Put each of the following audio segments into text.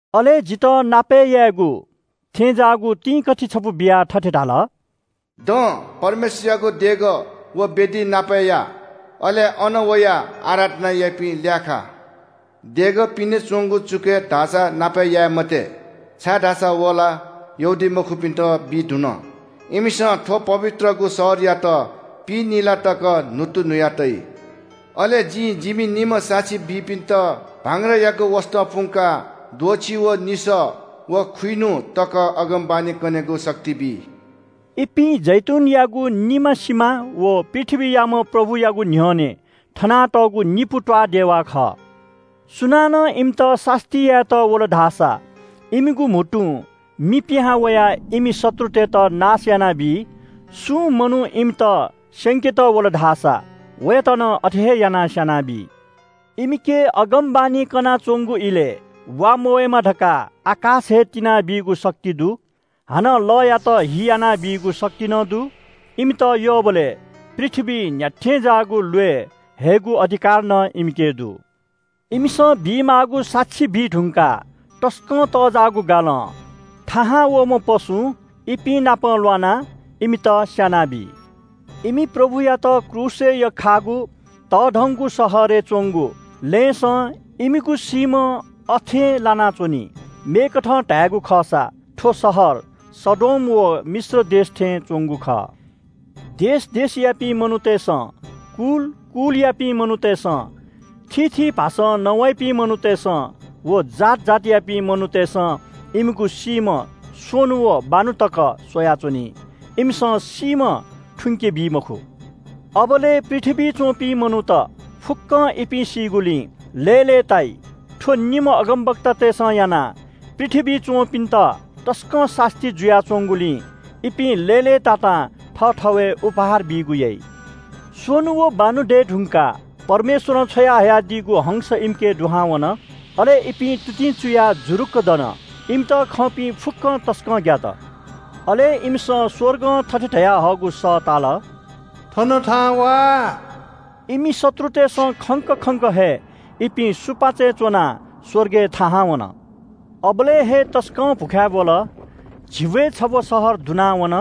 अले जितः नापय् यायेगु थें ज्‍याःगु तिंकथि छपु बियाः थथे धाल – “दँ, परमेश्‍वरयागु देगः, व वेदी नापय् या। अले अन वयाः आराधना याइपिं ल्‍याःखा। देगः पिने च्‍वंगु चुकय् धाःसा नापय् याये मते, छाय्‌धाःसा व ला यहूदीमखुपिन्‍त बी धुन। इमिसं थ्‍व पवित्रगु शहरयात पिइनिला तक न्‍हुत्तुन्‍हुया तइ। अले जिं जिमि निम्‍ह साक्षी बीपिन्‍त भांग्रायागु वसतं पुंकाः द्वःछि व निसः व खुइन्‍हु तक अगमवाणी कनेगु शक्ति बी।” इपिं जैतूनयागु निमा सिमा व पृथ्‍वीयाम्‍ह प्रभुयागु न्‍ह्यःने थनातःगु निपु त्‍वाःदेवा खः। सुनानं इमित सास्‍ती यायेत वल धाःसा इमिगु म्‍हुतुं मि पिहां वयाः इमि शत्रुतय्‌त नाश यानाबी। सुं मनू इमित स्‍यंकेत वल धाःसा वयात नं अथे हे यानाः स्‍यानाबी। इमिके अगमवाणी कनाच्‍वंगु इलय् वा मवय्‌मा धकाः आकाश हे तिनाबीगु शक्ति दु, हानं लःयात हि यानाबीगु शक्ति नं दु। इमित यःबलय् पृथ्‍वीइ न्‍ह्याथें ज्‍याःगु ल्‍वय् हयेगु अधिकार नं इमिके दु। इमिसं बीमाःगु साक्षी बीधुंकाः तसकं तःजाःगु गालं थाहां वःम्‍ह पशुं इपिंनापं ल्‍वानाः इमित स्‍यानाबी। इमि प्रभुयात क्रूसय् यख्‍खाःगु तःधंगु शहरय् च्‍वंगु लँय्‌सं इमिगु सीम्‍ह अथें लानाच्‍वनी। मेकथं धायेगु खःसा थ्‍व शहर सदोम व मिश्र देश थें च्‍वंगु खः। देश देशयापिं मनूतय्‌सं, कुल कुलयापिं मनूतय्‌सं, थीथी भाषां नवाइपिं मनूतय्‌सं व जात जातियापिं मनूतय्‌सं इमिगु सीम्‍ह स्‍वन्‍हु व बान्‍हु तक स्‍वयाच्‍वनी। इमिसं सीम्‍ह थुंके बी मखु। अबलय् पृथ्‍वीइ च्‍वंपिं मनूत फुक्‍कं इपिं सीगुलिं लय्‌लय्‌ताइ। थ्‍व निम्‍ह अगमवक्तातय्‌सं यानाः पृथ्‍वीइ च्‍वंपिन्‍त तसकं सास्‍ती जुयाच्‍वंगुलिं इपिं लय्‌लय्‌तातां थःथवय् कोसेलि बीगु याइ। स्‍वन्‍हु व बान्‍हु दये धुंकाः परमेश्‍वरं छ्वयाहयादीगु हंस इमिके दुहां वन। अले इपिं तुतिं चुयाः जुरुक्‍क दन। इमित खंपिं फुक्‍कं तसकं ग्‍यात। अले इमिसं स्‍वर्गं थथे धयाहःगु सः ताल – “थन थाहां वा।” इमि शत्रुतय्‌सं खंक खंक हे इपिं सुपाँचय् च्‍वनाः स्‍वर्गय् थाहां वन। अबलय् हे तसकं भ्‍वखाय् ब्‍वल। झिब्‍वय् छब्‍व शहर दुनावन।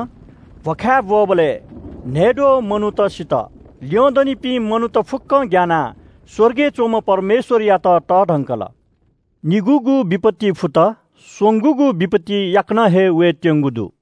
भ्‍वखाय् ब्‍वःबलय् न्‍हय्‌द्वः मनूत सित। ल्‍यंदनिपिं मनूत फुक्‍क ग्‍यानाः स्‍वर्गय् च्‍वंम्‍ह परमेश्‍वरयात तःधंकल। निगूगु विपत्ति फुत। स्‍वंगूगु विपत्ति याकनं हे वयेत्‍यंगु दु।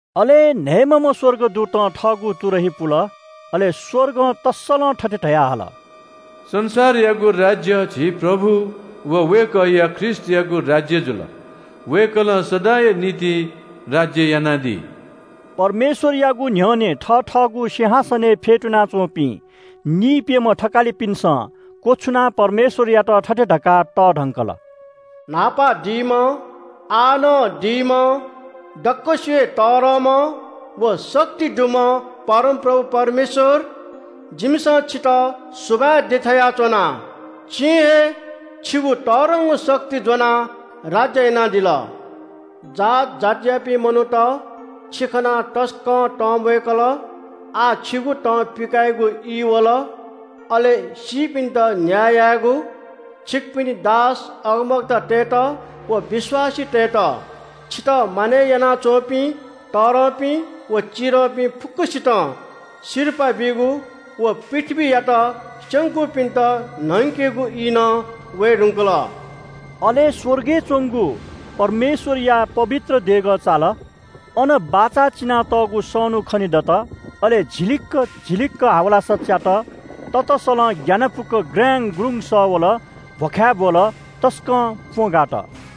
अले न्‍हय्‌म्‍हम्‍ह स्‍वर्गदूतं थःगु तुरही पुल। अले स्‍वर्गं तस्‍सलं थथे धयाहल – “संसारयागु राज्‍य झी प्रभु व वय्‌कःया ख्रीष्‍टयागु राज्‍य जुल। वय्‌कलं सदांया निंतिं राज्‍य यानादी।” परमेश्‍वरयागु न्‍ह्यःने थथःगु सिंहासनय् फ्‍यतुना च्‍वंपिं निइप्‍यम्‍ह थकालिपिन्‍सं क्‍वछुनाः परमेश्‍वरयात थथे धकाः तःधंकल – “न्‍हापा दीम्‍ह, आः नं दीम्‍ह, दक्‍वसिबय् तःधंम्‍ह व शक्ति दुम्‍ह परमप्रभु परमेश्‍वर जिमिसं छितः सुभाय् देछाया च्‍वना। छिं हे छिगु तःधंगु शक्ति ज्‍वनाः राज्‍य यानादिल। जात जातियापिं मनूत छि खनाः तसकं तंम्‍वय्‌कल। आः छिगु तं पिकायेगु ई वल, अले सीपिन्‍त न्‍याय यायेगु। छिकपिनि दास अगमवक्ताततय्‌त व विश्‍वासीतय्‌त, छितः मानय् यानाच्‍वंपिं तःधंपिं व चिधंपिं फुक्‍कसितं सिरपाः बीगु व पृथ्‍वीयात स्‍यंकूपिन्‍त न्‍हंकेगु ई नं वये धुंकल।” अले स्‍वर्गय् च्‍वंगु परमेश्‍वरया पवित्र देगः चाल। अन बाचा चिनातःगु सनू खनेदत। अले झिलिक्‍क झिलिक्‍क हावलासा च्‍यात, ततसलं ग्‍यानापुक ग्राङ्‌गग्रुङ्‌ग सः वल। भ्‍वखाय् ब्‍वल, तसकं प्‍वँ गात।